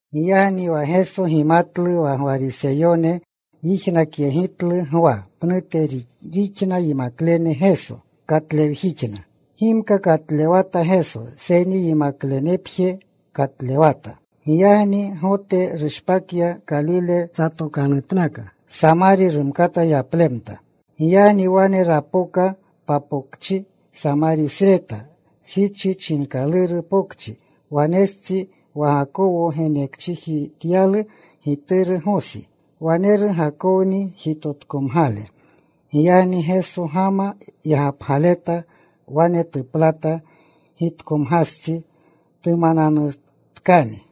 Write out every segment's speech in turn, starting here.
Giyagni wa Geso gimatlu wa Gwariseyone yijnakyegitlu Gwa pnute rixna yimaklene Geso. Katlewjixna. Gimka katlewata Geso, seyni yimaklenepje katlewata. Giyagni Gote rushpakya. Kalile satokanutnaka. Samarya rumkata yaplemta. Giyagni wane rapoka papokchi Samarisreta, Sicha chinkaluru pokchi, wanestsi wa Gakowo genekchijityalu gituru Gosi. Waneru Gakowni jitotkomgale. Giyagni Geso gama yagapleta. Wane tuplata gitkomgastsi. Tumananutkani.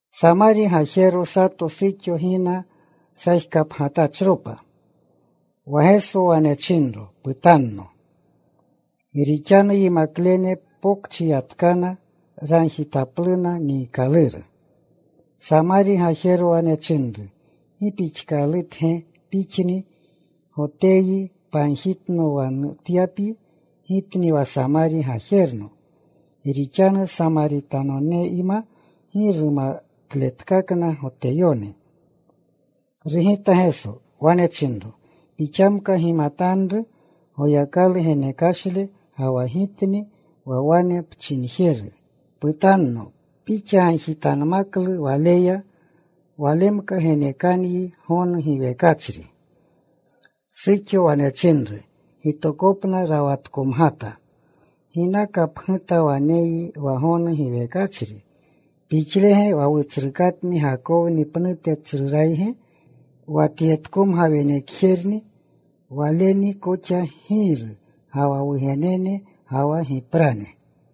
Samari gajero sato suxo gina sajkapgatachropa. Wa Geso wane chinro, “Putanno.” Gi rixanu yimaklene pokchi yatkana. Ragjitapluna niikaluru. Samari gajero wane chinru, “¿Gi pixkatge Pixni Goteyyi pagjitno wa nutyapyi, gitni wa Samari gajerno?” Gi rixanu Samaritanoneyma gi rumatletkakna Goteyone. Rugita Geso. Wane chinro, “Pixamka gimatanru Goyakalu genekashle ga wa Girni wa wane pchinjeru, ‘Putanno,’ pixa gagjitanmaklu Waleya. Walemka genekanyi gonu giwekachri.” Suxo wane chinru, “Gitokopna rawatkomgata. ¿Ginaka pguta waneyyi wa gonu giwekachri? ¿Pixlege wa wutsrukatni Gakowni pnute tsrurayge, wa tyetkomga wenekjerni, waleni koxa giiru, ga wa wugenene, ga wa giprane?”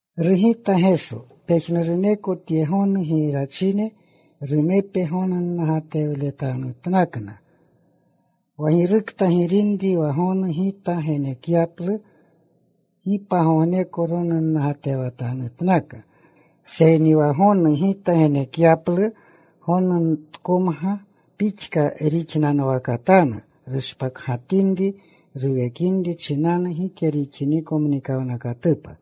Rugita Geso, “Pejnuruneko tye gonu girachine, rumepe gonunnagatlewletanatnakna. Wa girukta girinri wa gonu Gita genekyaplu gi pagogneko ronunnagatewatanutnaka. Seyni wa gonu Gita genekyaplu gonutkomga pixka rixnanwakatanu, rushpakgatinri ruwekinri chinanu gike rixiniko mnikawnakatupa.”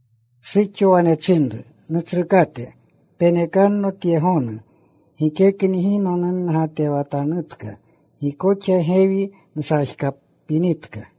Suxo wane chinru, “Nutsrukate, penekanno tye gonu, gikekni gi nonunnagatewatanutka. Gi koxa gewi nsajkapinitka.”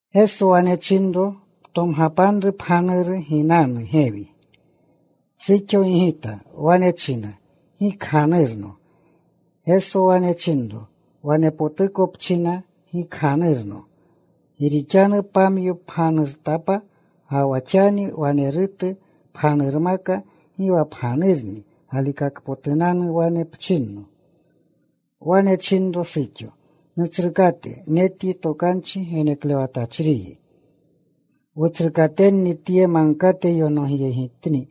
Geso wane chinro, “Ptomgapanru pganuru. Ginanu gewi.” Suxo gigita. Wane china, “Gi kganurno.” Geso wane chinro, “Wanepotuko pchina, ‘Gi kganurno,’ Gi rixanu pamyo pganurtapa. Ga wa xani wanerutu pganurmaka, gi wa pganurni. Galikakpotunanu wane pchinno.” Wane chinru suxo, “Nutsrukate, netyi tokanchi geneklewatachriyi. Wutsrukatenni tye magkate yonogyegitni.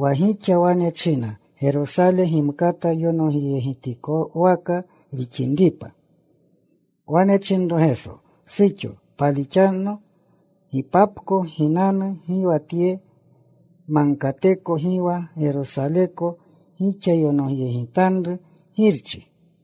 Wa gixa wane china, Gerosale gimkata yonogjetikwaka rixinripa.” Wane chinro Geso, “Suxo, palixanno, gipapko ginanu, gi wa tye magkateko, gi wa Gerosaleko gixa yonogyegitanru Girchi.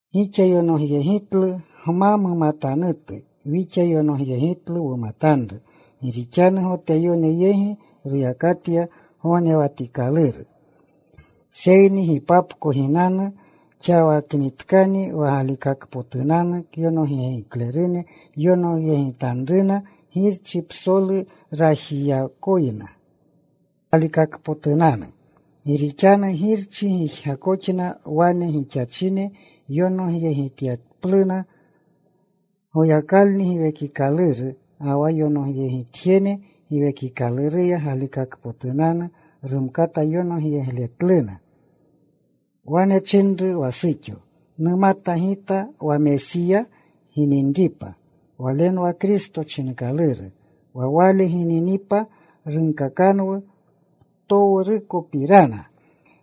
Gixa yonogyegitlu gma mumatanutu. Wixa yonogyegitlu wumatanru. Gi rixanu Goteyone yegi ruyakatya gognewatikaluru. Seyni gipapko ginanu, xawaknitkani, wa galikakpotunanu kyonogiklerune yonogyegitanruna Girchi psolu rajyakoyna, galikakpotunanu. Gi rixanu Girchi gijgakoxna wane gixachine yonogyegityapluna. Goyakalni Giwekikaluru, ga wa yonogyegitjene Giwekikaluruya galikakpotunanu, rumkata yonogyegletluna.” Wane chinru wa suxo, “Numata gita wa Mesiya gininripa—Walenwa Kristo chinkaluru—wa Wale gininipa runkakanwu ptowrukopirana.”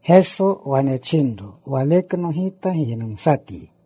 Geso wane chinro, “Walekno Gita giynumsatyi.”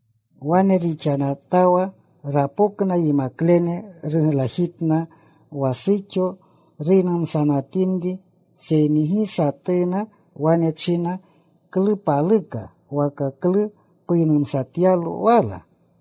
Wane rixanatawa rapokna yimaklene. Ruglajitna wa suxo ruynumsanatinri. Seyni gi satuna wane china, “¿Klu paluka?” waka “¿Klu puynumsatyalo wala?”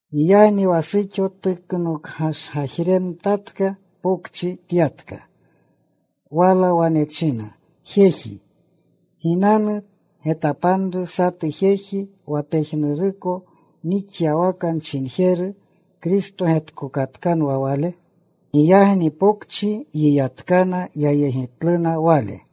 Giyagni wa suxo tuknokgashgajremtatka. Pokchi tyatka. Wala wane chinna jejine, “Ginanu. Getapanru satu jeji, wa pejnuruko nixyawaka nchinjeru. ¿Kristo getkokatkanwa Wale?” Giyagni pokchi yiyatkana. Yayegitluna Wale.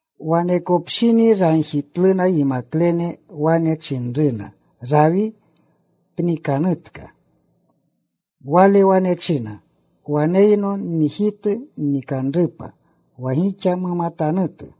Wanekopshini ragjitluna yimaklene. Wane chinruna, “Rawi, pnikanutka.” Wale wane chinna, “Waneyno nnijitu nnikanrupa wa gixa mumatanutu.”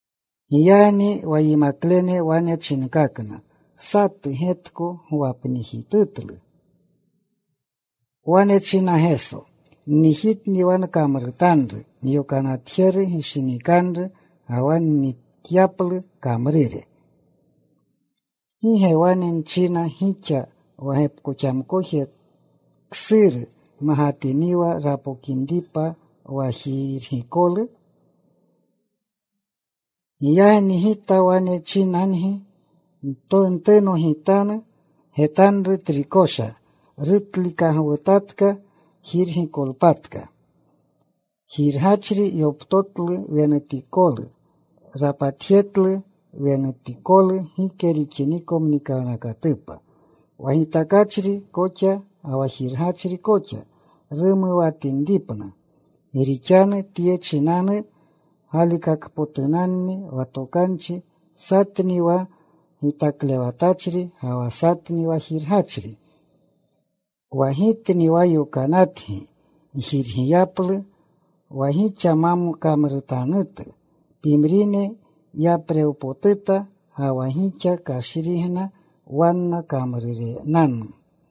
Giyagni wa yimaklene wane chinkakna, “¿Satu getko gwapnijitutlu?” Wane chinna Geso, “Nnijitni wa nkamrutanru nyokanatjeru gishinikanru, ga wa nnikatyaplu kamrure. ¿Gi ge wane nchina gixa, wa gepkoxamkoje ksuru magatiniwa rapokinripa wa jirgikolu? Giyagni Gita wane chinyagi, ntunogitanu. Getanru trikosha. Rutlikagwutatka jirgikolpatka. Jirgachri yoptotlu wenutikolu. Rapatjetlu wenutikolu gike rixiniko mnikawnakatupa, wa gitakachri koxa ga wa jirgachri koxa rumuwatinripna. Gi rixanu tye chinanu galikakpotunanni wa tokanchi, ‘Satni wa gitaklewatachri, ga wa satni wa jirgachri.’ Wa Gitni wa yokanatgi gjirgiyaplu wa gixa ma kamruretanutu. Pimrine yaprewpotuta, ga wa gixa kashrigna wanna kamrurenanu.”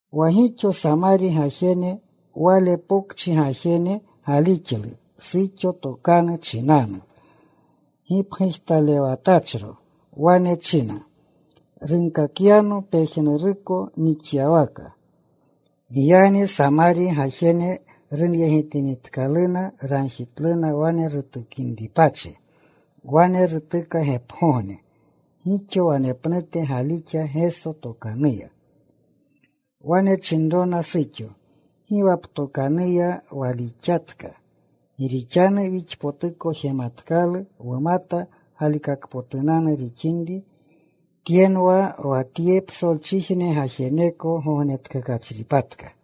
Wa gixo Samari gajene wale pokchi gajene galixlu suxo tokanu chinanu, gipgujtalewatachro. Wane china, “Runkakyano pejnuruko nixyawaka.” Giyagni Samari gajene runyegitinitkaluna, ragjitluna wane rutukinripachi. Wane rutuka gepgogne. Gixo wanepnute galixa Geso tokanuya. Wane chinrona suxo, “Gi wa ptokanuya walixatka, gi rixanu wixpotuko jematkalu. Wumata galikakpotunanu rixinri Tyenwa wa tye psolchijne gajeneko gognetkakachripatka.”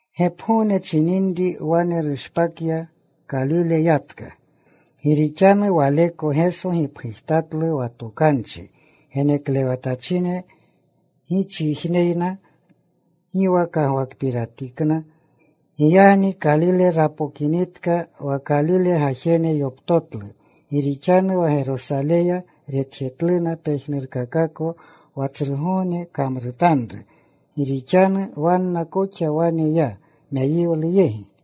Gepgogne chininri wane rushpakya. Kalile yatka. Gi rixanu Waleko Geso gipgujtatlu wa tokanchi geneklewatachine gichijneyna gi wa kagwakpiratikna. Giyagni Kalile rapokinitka, wa Kalile gajene yoptotlu, gi rixanu wa Gerosaleya retjetluna pejnurkakako wa tsrugogne kamrutanru. Gi rixanu wanna koxa wane ya meyiwlu yegi.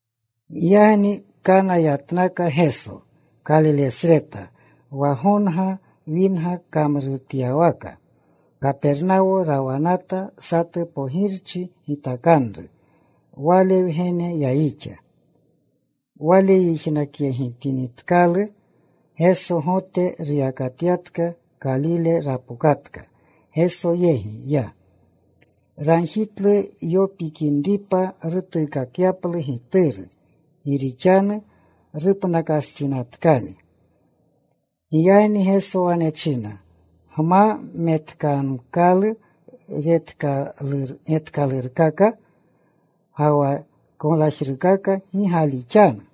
Giyagni Kana yatnaka Geso, Kalilesreta, wa gonga winga kamrutyawaka. Kapernawo rawanata satu pogirchi gitakanru. Wale wgene yayixa. Wale yijnakyegitinitkalu Geso Gote ruyakatyatka. Kalile rapokatka. Geso yegi ya. Ragjitlu yopikinripa rutuukakyaplu gituru, gi rixanu rupnakastsinatkani. Giyagni Geso wane china, “Gma metkamkalu getkalurkaka, ga wa koglajrukaka, gi galixanu.”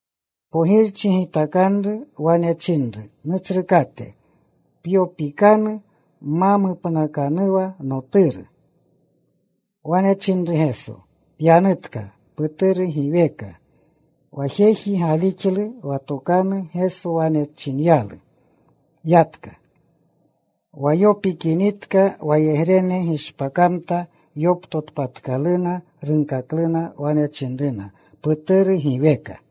Pogirchi gitakanru wane chinru, “Nutsrukate, pyopikanu ma mupnakanuwa noturu.” Wane chinru Geso, “Pyanutka. Puturu giweka.” Wa jeji galixlu wa tokanchi Geso wane chinyalu. Yatka. Wa yopikamtinitka wayegrene gishpakamta yoptotpatkaluna. Runkakluna. Wane chinruna, “Puturu giweka.”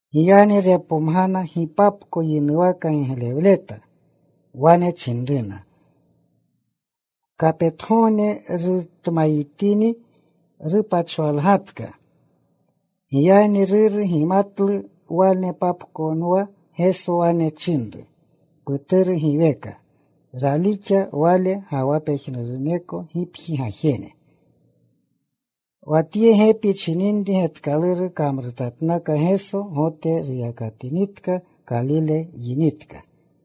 Giyagni repomgana gipapko yinuwaka giglewleta. Wane chinruna, “Kapetgogne rutmayitini, rupachwalgatka.” Giyagni ruru gimatlu wanepapkonwa Geso wane chinru, “Puturu giweka.” Ralixa wale, ga wa pejnuruneko gipji gajene. Wa tye gepi chininri getkaluru kamrutatnaka Geso, Gote ruyakatinitka. Kalile yinitka.